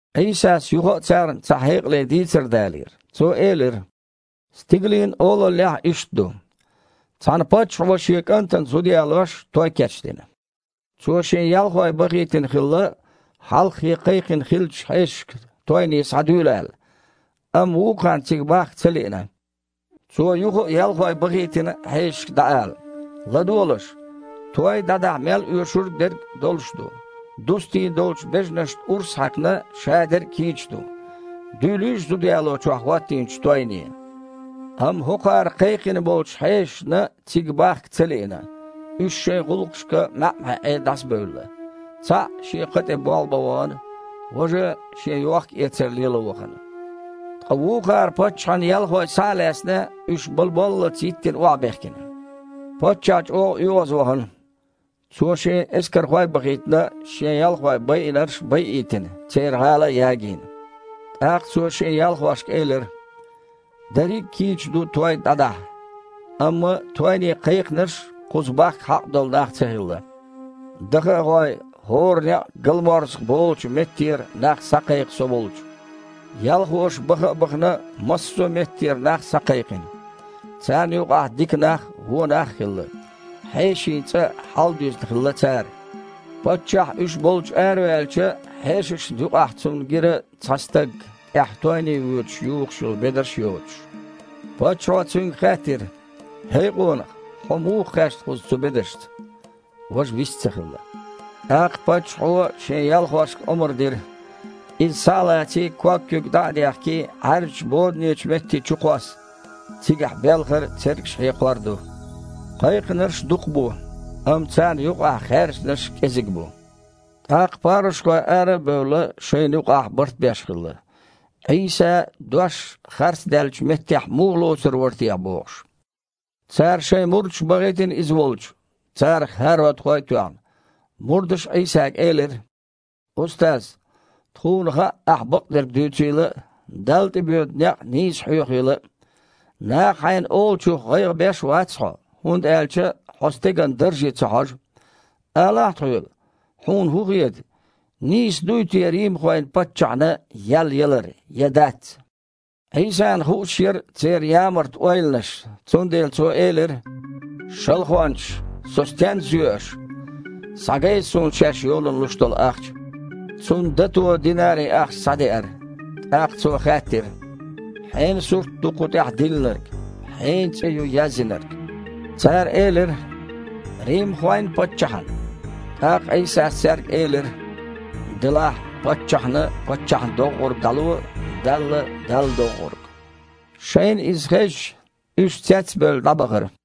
Іийсас юха а царна цхьа хьекъале дийцар далийра. Цо элира: «Стигалийн Олаллехь иштта ду. Цхьана паччахьо шен кІантана зуда ялош той кечдина. Цо шен ялхой бахийтина хилла, хьалххе кхайкхина хиллачу хьешашка тойне схьадуьйла аьлла, амма вукхарна цига бахка ца лиъна. Цо юха а ялхой бахийтина хьешашка дІаала: „ЛадогІалаш. Той дІадахьа мел оьшуш дерг долуш ду. Дустийна долчу бежанашна урс а хьаькхна, шадерг а кийча ду. Дуьйлийша зуда ялочохь хІоттийначу тойне“. Амма хІокхара кхайкхина болчу хьешашна цига бахка ца лиъна, уьш шайн гІуллакхашка маьІ-маьІІе дІасабевлла. Цхьаъ шен кха тІе болх бан вахана, важа шен йохкаэцар лело вахана, ткъа вукхара, паччахьан ялхой схьа а лаьцна, уьш бала боллалц йиттина охьабехкина. Паччахь чІогІа оьгІазвахана. Цо, шен эскархой а бахийтина, шен ялхой байинарш байийтина, церан гІала а ягийна. ТІаккха цо шен ялхошка элира: „Дерриг а кийча ду той дІадахьа. Амма тойне кхайкхинарш кхуза бахка хьакъ долу нах ца хилла. Даха а гІой, хІора некъ галморзаха болучу меттера нах схьакхайкха со волчу“. Ялхоша, баха а бахана, массо а меттера нах схьакхайкхина. Царна юкъахь дика нах а, вон нах а хилла. Хьешийн цІа хьаладуьзна хилла цара. Паччахь уьш болчу араваьлча, хьешашна юкъахь цунна гира цхьа стаг, тІехь тойне воьдуш юхуш йолу бедарш а йоцуш. Паччахьо цуьнга хаьттира: „ХІей къонах, хьо муха кхаьчна кхуза цу бедаршца?“ Важа вист ца хилла. ТІаккха паччахьо шен ялхошка омра дира: „Иза, схьа а лаций, ког-куьг дІа а дехкий, Іаьржачу боданечу метте чукхосса. Цигахь белхар а, цергаш хьекхор а ду“. Кхайкхинарш дукха бу, амма царна юкъахь хаьржинарш кІезиг бу». ТІаккха парушхой, ара а бевлла, шайна юкъахь барт беш хилла, Іийса дош харцдаьллачу меттехь муха лоцур вара техьа бохуш. Цара шайн мурдаш бахийтина Иза волчу, царах хІародхой а тоьхна. Мурдаша Іийсага элира: «Устаз! Тхуна хаьа Ахьа бакъдерг дуьйцийла а, Далла тІе боьду некъ нийса хьоьхийла а. Наха Хьайна олучух гІайгІа беш а вац Хьо, хІунда аьлча Хьо стеган дарже ца хьожу. Алахьа тхоьга, Хьуна хІун хета, нийса дуй те римхойн паччахьна ял ялар я дац?» Іийсана хууш яра церан ямарта ойланаш, цундела Цо элира: «Шалхончаш! Со стенна зоь аш? Схьагайта Суна шаьш йолана луш долу ахча». Цунна дато динари-ахча схьадеара. ТІаккха Цо хаьттира: «Хьенан сурт ду кху тІехь диллинарг, хьенан цІе ю язйинарг?» Цара элира: «Римхойн паччахьан». ТІаккха Іийсас цаьрга элира: «Делахь, паччахьна паччахьна доггІург дІало, Далла – Далла доггІург». Шайна иза хезча, уьш, цец а бевлла, дІабахара.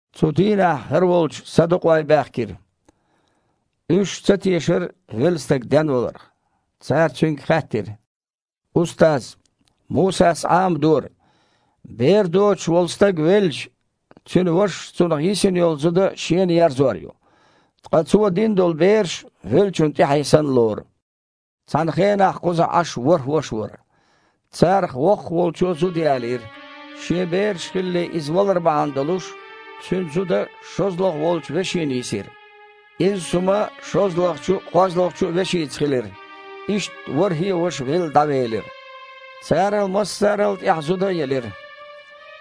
Цу дийнахь ХІара волчу садукъой баьхкира. Уьш ца тешара велла стаг денваларх. Цара Цуьнга хаьттира: «Устаз, Мусас Іамадора: бер доцуш волу стаг велча, цуьнан вашас цунах йисина йолу зуда шена ерзор ю, ткъа цо дина долу бераш веллачун тІаьхье санна лору. Цхьана хенахь кхузахь Іаш ворхІ ваша вара. Царах воккхаха волчо зуда ялийра. Шен бераш хилале иза валар бахьана долуш, цуьнан зуда шозлагІа волчу вешина йисира. Изза хІума шозлагІчу а, кхозлагІчу а вешица хилира. Иштта ворхІе а ваша велла дІавелира. Царал массарал а тІаьхьа зуда елира.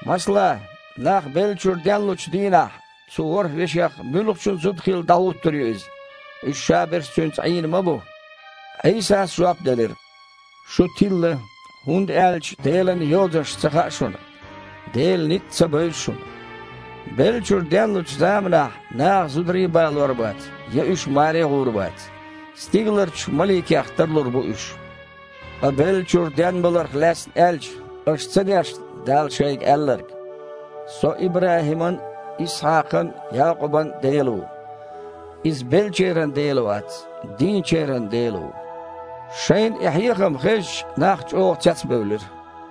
Масала, нах беллачуьра денлучу дийнахь цу ворхІ веших муьлхачун зуда хилла дІахІуттур ю иза? Уьш шаберш а цуьнца Іийна ма бу». Іийсас жоп делира: «Шу тилла, хІунда аьлча Делан Йозанаш ца хаьа шуна, Делан ницкъ а ца бевза шуна. Беллачуьра денлучу заманахь наха зударий а балор бац, я уьш маре а гІур бац. Стигаларчу маликех тарлур бу уьш. Ткъа беллачуьра денбаларх лаьцна аьлча, аша ца дешна Дала шайга аьлларг: „Со ИбрахІиман а, Исхьакхан а, Якъубан а Дела ву“? Иза беллачеран Дела вац, дийначеран Дела ву!» Шайна и хьехам хезча, нах чІогІа цецбевлира.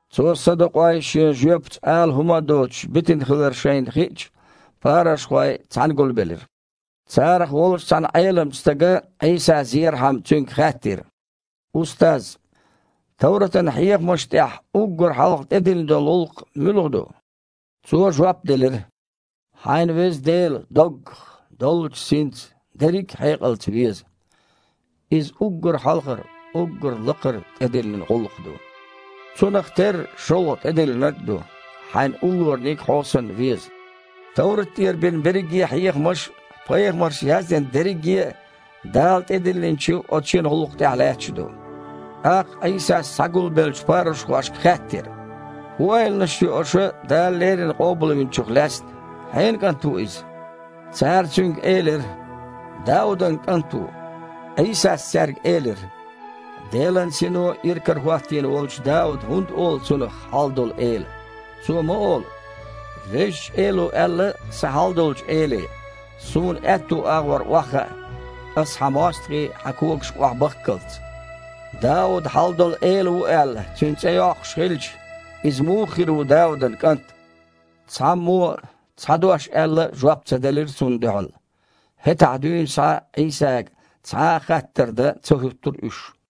Цо садукъой Шен жоьпаца ала хІума а доцуш битина хилар шайна хиъча, парушхой цхьаьна гулбелира. Царах волчу цхьана Іеламчу стага, Іийса зерхьама, Цуьнга хаьттира: «Устаз, товратан хьехамашна тІехь уггар хьалха тІедиллина долу гІуллакх муьлха ду?» Цо жоп делира: «„Хьайн Веза Дела доггах, доллучу синца, дерриг а хьекъалца веза“. Иза уггар хьалхара, уггар лакхара тІедиллина гІуллакх ду. Цунах терра шолгІа тІедиллинарг а ду: „Хьайн уллораниг хьо санна веза“. Товрат тІера бина берриге а хьехамаш а, пайхамарша яздина дерриге а Дала тІедиллинчу оцу шина гІуллакх тІехь лаьтташ ду». ТІаккха Іийсас схьагулбеллачу парушхошка хаьттира: «ХІун ойланаш йо аша Дала леррина Къобалвинчух лаьцна? Хьенан КІант ву Иза?» Цара Цуьнга элира: « Даудан КІант ву». Іийсас цаьрга элира: «Делан Сино иракарахІоттийна волчу Дауда хІунда олу Цунах „Хьалдолу Эла“? Цо ма олу: „Везачу Эло аьлла сан Хьалдолчу Эле: ‘Суна аьтту агІор охьахаа, Аса Хьан мостагІий Хьан когашка охьабахккалц’“. Дауда „Хьалдолу Эла“ ву аьлла, Цуьнан цІе йоккхуш хилча, Иза муха хир ву Даудан кІант?» Цхьаммо а, цхьа дош аьлла а, жоп ца делира Цунна дуьхьал. ХІетахь дуьйна схьа Іийсага цхьа а хаттар дан ца хІуттура уьш.